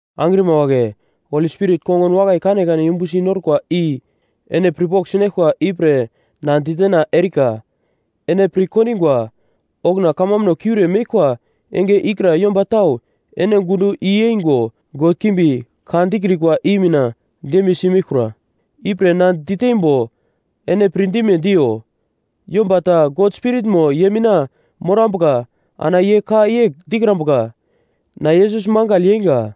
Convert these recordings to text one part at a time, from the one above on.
Angrima wagle, Holi Spirit kongun wakai kanekane yumbusi norkwa i ene pirpogl sinaglkwa ipre na ditena erikwa. Ene pir kondingwa, okuna kamambuno kiure meglkwa enge ikra yomba tau ene gundo i-yeingo god kimbi ka dikrikwa i mina dembiyesi meglkura. Ipre na diteimbo ene pirdime diyo: Yomba ta God Spiritmo ye mina morambuka ana ye ka yegl dikrambuka, “Na Yesus mangagl yeinga.”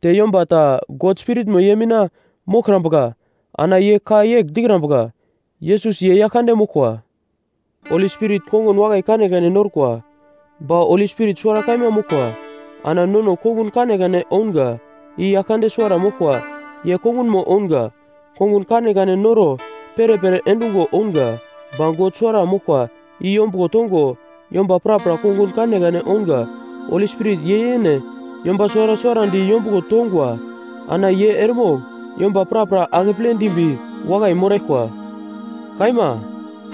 Te yomba ta God Spiritmo ye mina moglkrambuka ana ye ka yegl dikrambuka, “Yesus ye Yaglkande moglkwa.” Holi Spirit kongun wakai kanekane norkwa, ba Holi Spirit suwara kaima moglkwa. Ana nono kongun kanekane ounga, i Yaglkande suwara moglkwa ye kongunmo ounga. Kongun kanekane noro perepere endungo ounga, ba God suwara moglkwa i yombuglo tongo yomba prapra kongun kanekane ounga. Holi Spirit ye yene yomba suwara suwarandi yombuglo tongwa; ana ye eremogl yomba prapra akeple dimbi wakai moraglkwa. Kaima,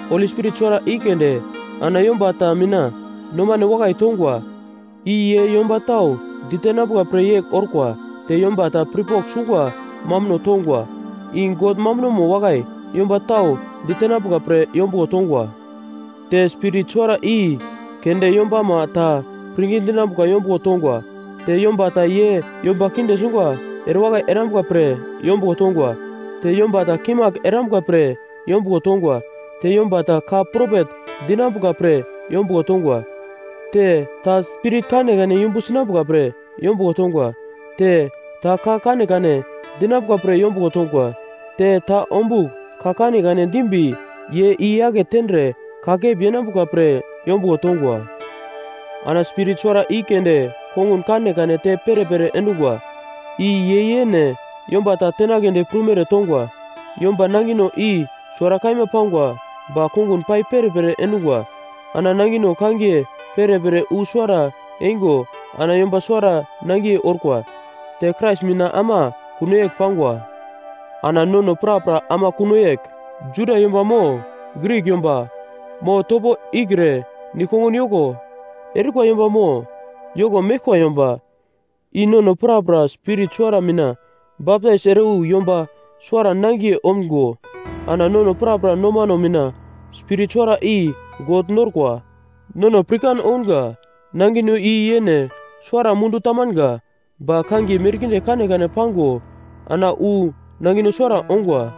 Holi Spirit suwara i keunde ana yomba ta mina nomane wakai tongwa, i ye yomba tau ditenambuka pre yegl orkwa, te yomba ta pirpogl sungwa mambuno tongwa, i God mambunomo wakai yomba tau ditenambuka pre yombuglo tongwa. Te Spirit suwara i keunde yombama ta pirngi dinambuka yombuglo tongwa, te yomba ta ye yomba kinde sungwa erewakai erambuka pre yombuglo tongwa, te yomba ta kimagl erambuka pre yombuglo tongwa, te yomba ta ka propet dinambuka pre yombuglo tongwa, te ta spirit kanekane yumbu sinambuka pre yombuglo tongwa, te ta ka kanekane dinambuka pre yombuglo tongwa, te ta ombugl ka kanekane dimbi ye i-yake tendre kakep yenambuka pre yombuglo tongwa. Ana Spirit suwara i keunde kongun kanekane te perepere endungwa, i ye yene yomba ta tenagledi prumere tongwa. Yomba nangino i suwara kaima pangwa ba konguno pai perepere endungwa. Ana nangino kangiye perepere i wu suwara yeingo ana yomba suwara nangiye orkwa, te Krais mina ama kuno yegl pangwa. Ana nono prapra ama kuno yegl; Juda yomba mo Grik yomba, mo topo ikre nigl-kongun yoko erikwa yomba mo yoko meglkwa yomba, i nono prapra Spirit suwara mina baptais ere wu yomba suwara nangiye omgo ana nono prapra nomano mina Spirit suwara i God norkwa. Nono pirkan ounga, nangino i yene suwara mundu tamanga, ba kangiye merkinde kanekane pango ana wu nangino suwara ongwa.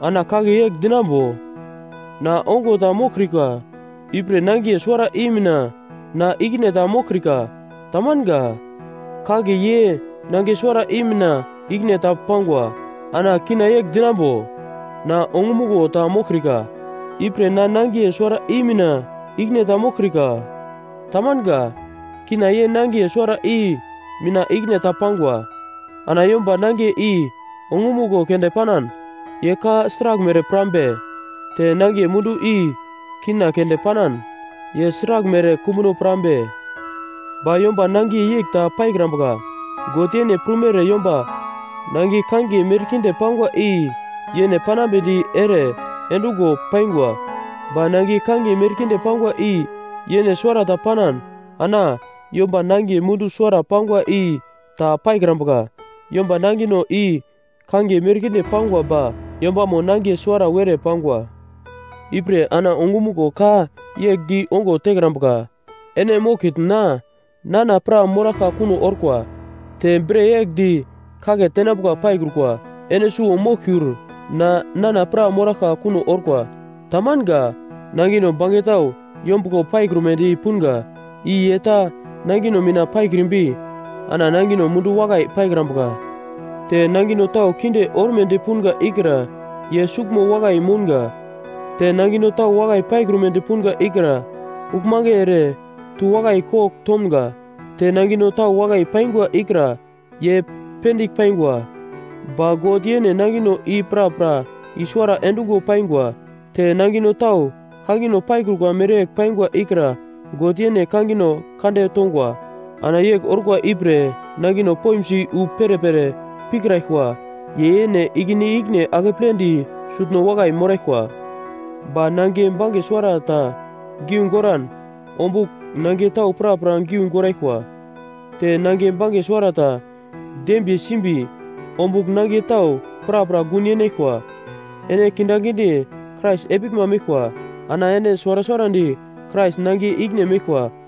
Ana kagle yegl dinambo, “Na ongo ta moglkrika, ipre nangiye suwara i mina na ikine ta moglkrika.” Tamanga. Kagle ye nangiye suwara i mina ikine ta pangwa. Ana kina yegl dinambo, “Na ongumuglo ta moglkrika, ipre na nangiye suwara i mina ikine ta moglkrika.” Tamanga. Kina ye nangiye suwara i mina ikine ta pangwa. Ana yomba nangiye i ongumuglo keunde panan, ye ka sraglmere pirambe? Te nangiye mundu i kina keunde panan, ye sraglmere kumbuno pirambe? Ba yomba nangiye yegl ta paikrukwa. God yene prumere yomba nangiye kangiye merkinde pangwa i yene panambedi ere endungo paingwa. Ba nangiye kangiye merkinde pangwa i yene suwarata panan, ana yomba nangiye mundu suwara pangwa i ta paikrambuka. Yomba nangino i kangiye merkinde pangwa ba yombamo nangiye suwara-wera pangwa. Ipre ana ongumuglo ka yegl di ongo tekrambuka, “Ene moglkitn na nana pra moraglka kuno orkwa.” Te bre yegl di kagle tenambuka paikrukwa, “Ene suwo moglkiur na nana pra moraglka kuno orkwa.” Tamanga. Nangino bange tau yombuglo paikrumedi punga, i ye ta nangino mina paikrimbi ana nangino mundu wakai paikrambuka. Te nangino tau kinde ormedi punga ikra ye suglmo wakai mounga. Te nangino tau wakai paikrumedi punga ikra uglmange ere tu wakai kogl tomga. Te nangino tau wakai paingwa ikra ye pendigl paingwa, ba God yene nangino i prapra i-suwara endungo paingwa. Te nangino tau kangino paikrukwa mereyegl paingwa ikra God yene kangino kande tongwa. Ana yegl orkwa ipre nangino poimsi wu perepere pirkraglkwa ye yene ikine-ikine akepledi sutno wakai moraglkwa. Ba nangiye bange suwarata giu goran ombugl nangiye tau prapra giu goraglkwa. Te nangiye bange suwarata dembiye simbi, ombugl nangiye tau prapra gun yenaglkwa. Ene kindaginde Krais epiglma meglkwa. Ana ene suwara suwarandi Krais nangiye ikine meglkwa.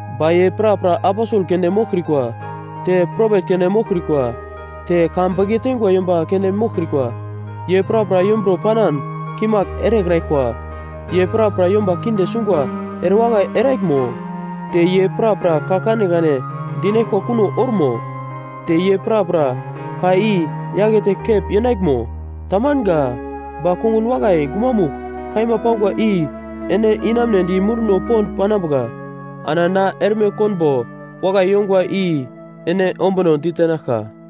Ba ye prapra aposel keunde moglkrikwa, te propet keunde moglkrikwa, te ka beke teingwa yomba keunde moglkrikwa. Ye prapra yomburo panan kimagl erekraglkwa. Ye prapra yomba kinde sungwa erewakai eraglmo? Te ye prapra ka kanekane dinaglkwa kuno ormo? Te ye prapra ka i-yakete kep yenaglmo? Tamanga. Ba kongun wakai gumamugl kaima pangwa i ene inamunedi munduno pond panambuka. Ana na erme konbo wakai yongwa i ene ombuno ditenaglka.